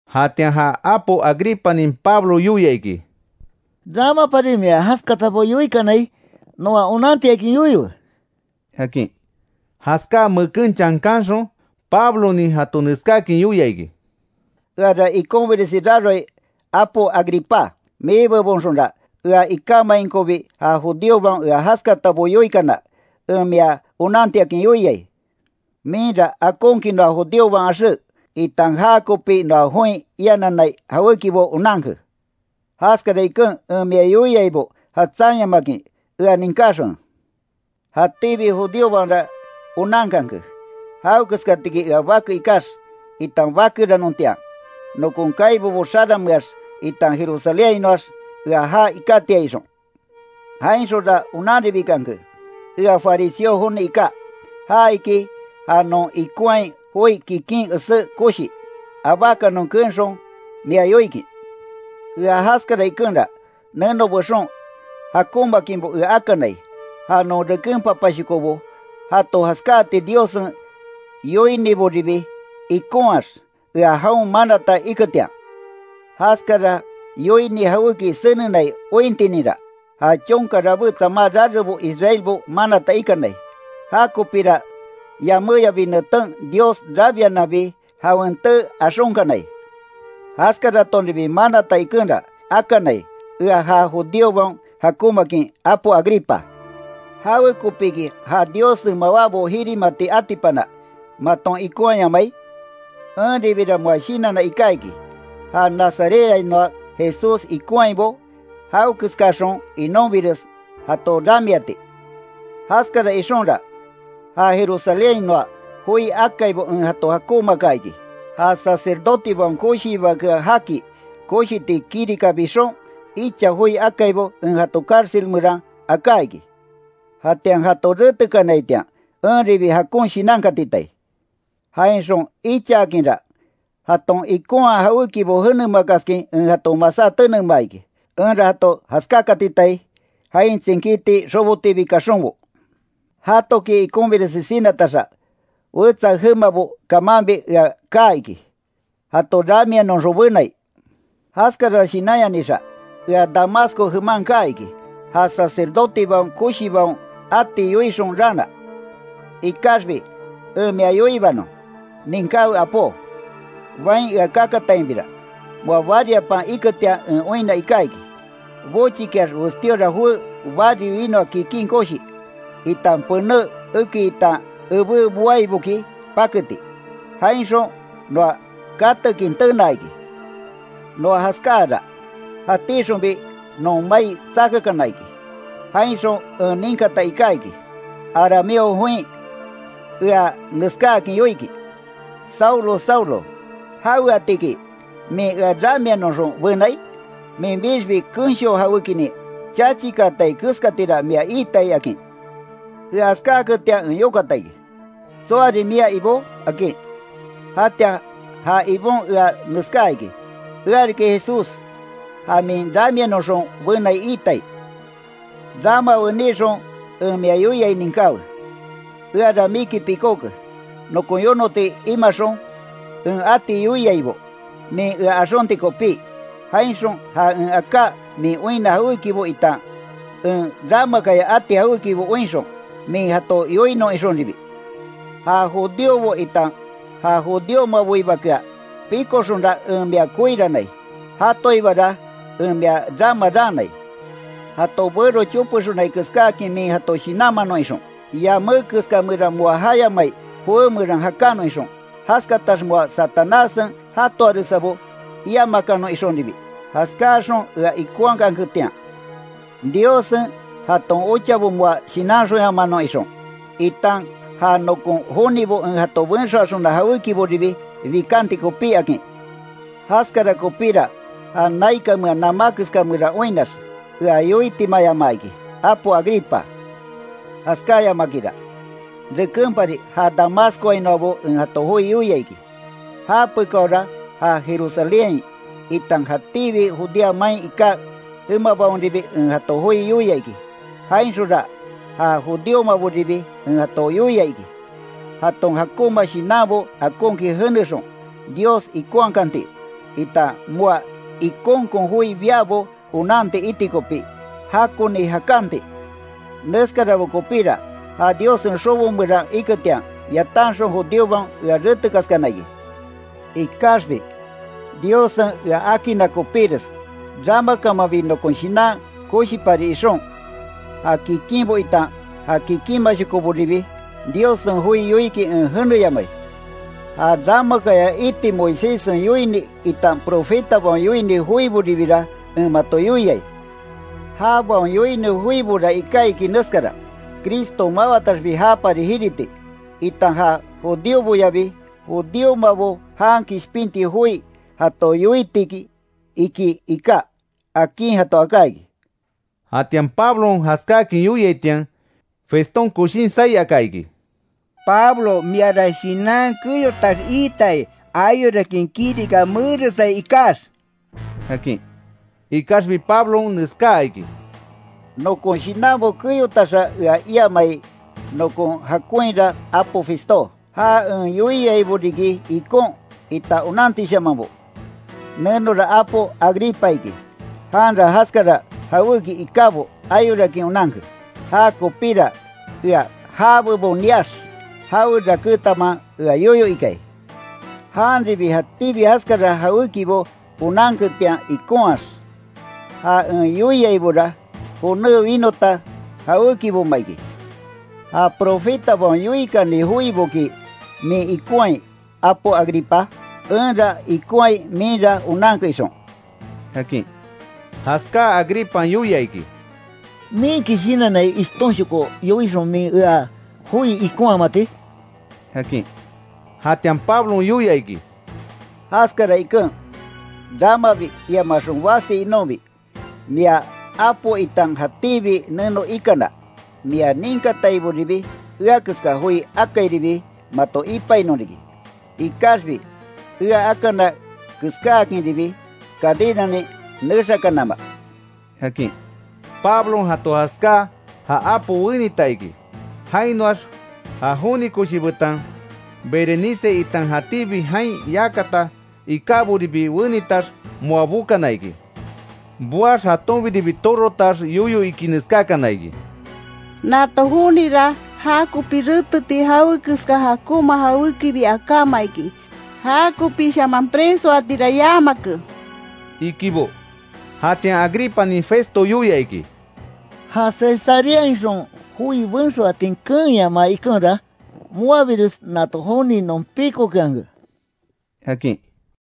Jatian ja apo Agripanin Pablo yoia iki: —Ramapari mia jaskatabo yoikanai, noa onantiakin yoiwe —akin. Jaskáa meken chankanxon, Pablonin jato neskáakin yoia iki: “Eara ikonbiresi raroai apo Agripá; mibebonxonra, ea ikamainkobi ja judíobaon ea jaskatabo yoikana, en mia onantiakin yoiai. Minra akonkin noa judíobaon axé, itan jakopi noa join iananai jawékibo onanke. Jaskara iken en mia yoiaibo jatsanyamakin, ea ninkáxonwe. Jatíbi judíobaonra onankanke, jawekeskatiki ea bake ikax, itan bakeranontian, nokon kaibobo xarameax itan Jerusalénhainoax ea jaa ikátiai, ixon. Jainxonra onanribikanke, ea fariseo joni iká. Ja iki, ja non ikonhai joi kikin esé koshi. Abákanon keenxon, mia yoikin. Ea jaskara ikenra, neno bexon jakonmaakinbo ea akanai. Ja non reken papashokobo jato jaskáati Diossen yoiniboribi ikonhaax, ea jaon manata iketian. Jaskara yoini jawéki senenai ointininra, ja chonka rabé tsamaa rarebo Israelbo manata ikanai. Jakopira yaméyabi neten Dios rabiananbi jawen tee axonkanai. Jaskaratonribi manata ikenra, akanai, ea ja judíobaon jakonmaakin apo Agripa. ¿Jawekopiki ja Diossen mawábo jirimati atipana, maton ikonhayamai? Enribira moa shinanna iká iki, ja Nazarethainoa Jesús ikonhaibo jawekeskaxon inonbires, jato ramiati. Jaskara ixonra, ja Jerusalénhainoa joi akaibo en jato jakonmaaka iki. Ja sacerdotebaon koshiibakea jaki, koshiti kirika bixon, icha joi akaibo en jato cárcel meran aká iki. Jatian jato retekanaitian, enribi jakon shinankatitai. Jainxon ichaakinra, jaton ikonhaa jawékibo jenemakaskin en jato masá tenemaa iki, enra jato jaskáakatitai, jain tsinkíti xobotiibi kaxonbo. Jatoki ikonbiresi sinataxa, wetsa jemabo kamanbi ea kaa iki, jato ramianoxon benai. Jaskara shinanyanixa, ea Damasco jeman kaa iki, ja sacerdotebaon koshibaon ati yoixon raana. Ikaxbi en mia yoibanon, ninkáwe apó: Bain ea kakatainbira, moa bariapan iketian en oinna iká iki, bochikiax westíora joé bari winoa kikin koshi, itan pené eki itan ebé boaiboki paketi, jainxon noa katekin tenaa iki. Noa jaskáara, jatíxonbi non mai tsakakana iki, jainxon en ninkata iká iki, arameo join ea neskáakin yoikin: ‘Saulo, Saulo, ¿Jaweatiki min ea ramianoxon benai? Minbixbi kensho jawékinin chachikaatai keskatira mia iitai’, akin. Ea jaskáaketian en yokata iki: ‘¿Tsoarin mia Ibó?’ akin. Jatian ja Ibon ea neskaa iki: ‘Ea riki Jesús, ja min ramianoxon benai iitai. Rama wenixon en mia yoiai ninkáwe. Eara miki pikóke, nokon yonoti imaxon, en ati yoiaibo min ea axonti kopí. Jainxon ja en aká min oinna jawékibo itan en ramakaya ati jawékibo oinxon, min jato yoinon ixonribi. Ja judíobo itan ja judíomaboibakea píkoxonra en mia koirannai, jatoibara en mia rama raanai. Jato bero chopexonai keskáakin min jato shinanmanon ixon, yamé keska meran moa jayamai joé meran jakanon ixon, jaskatax moa Satanássen jatoaresabo iamakanon ixonribi, jaskáaxon ea ikonhaketian, Diossen jaton ochabo moa shinanxonyamanon ixon, itan ja nokon jonibo en jato benxoaxona jawékiboribi bikanti kopí’, akin. Jaskara kopíra ja naikanmea namá keska meran oinnax, ea yoitimayamaa iki, apo Agripa. Jaskáyamakinra, rekenpari ja Damascoainoabo en jato joi yoia iki; japekaora ja Jerusalénhain, itan jatíbi Judea main iká jemabaonribi en jato joi yoia iki. Jainxonra ja judíomaboribi en jato yoia iki, jaton jakonma shinanbo akonkin jenexon, Dios ikonhakanti, itan moa ikonkon joi biabo onanti iti kopi, jakoni jakanti. Neskarabo kopíra, ja Diossen xobo meran iketian, yatanxon judíobaon ea retekaskana iki. Ikaxbi Diossen ea akinna kopíres, ramakamanbi nokon shinan koshipari ixon, ja kikinbo itan ja kikinmashokoboribi Diossen joi yoikin en jeneyamai. Ja ramakaya iti Moiséssen yoini itan profetabaon yoini joiboribira en mato yoiai. Jabaon yoini joibora iká iki neskara: Cristo mawataxbi japari jiriti, itan ja judíoboyabi, judíomabo jan kishpinti joi jato yoitiki”, iki iká, akin jato aká iki. Jatian Pablon jaskáakin yoiaitian, Feston koshin saí aka iki: —¡Pablo miara shinan keyotax iitai, ayorakin kirika meeresai ikax! —akin. Ikaxbi Pablon neskaa iki: —Nokon shinanbo keyotaxa ea iiamai, nokon jakonhira apo Festó. Ja en yoiaibo riki ikon, itan onantishamanbo. Nenora apo Agripa iki, janra jaskara jawéki ikábo ayorakin onanke. Jakopíra ea já bebon niax, jawe rakétanma ea yoyo ikai. Janribi jatíbi jaskara jawékibo onanketian ikonhaax, ja en yoiaibora joné winota jawékiboma iki. ¿Ja profetabaon yoikani joiboki min ikonhai, apo Agripa? Enra ikonhai minra onanke ixon —akin. Jaskáa Agripan yoia iki: —¿Minki shinannai, ishtonshoko yoixon min ea joi ikonhamati? —akin. Jatian Pablon yoia iki: —Jaskara iken, ramabi iamaxon basi inonbi, mia apo itan jatíbi neno ikana, mia ninkataiboribi ea keska joi akairibi mato ipainon riki. Ikaxbi ea akana keskáakinribi, cadenanin nexakanama —akin. Pablon jato jaskáa, ja apo wenita iki, jainoax ja joni koshi betan Berenice, itan jatíbi jain yakata ikáboribi wenitax, moa bokana iki. Boax, jatonbiribi torotax yoyo iki neskákana iki: —Nato jonira, jakopi reteti jawekeska jakonma jawékibi akáma iki, ja kopishaman presoatira yamake —ikibo. Jatian Agripanin Festo yoia iki: —Ja Cesareainxon joi benxoatin keenyamaa ikenra, moabires nato joni non píkokeanke —akin.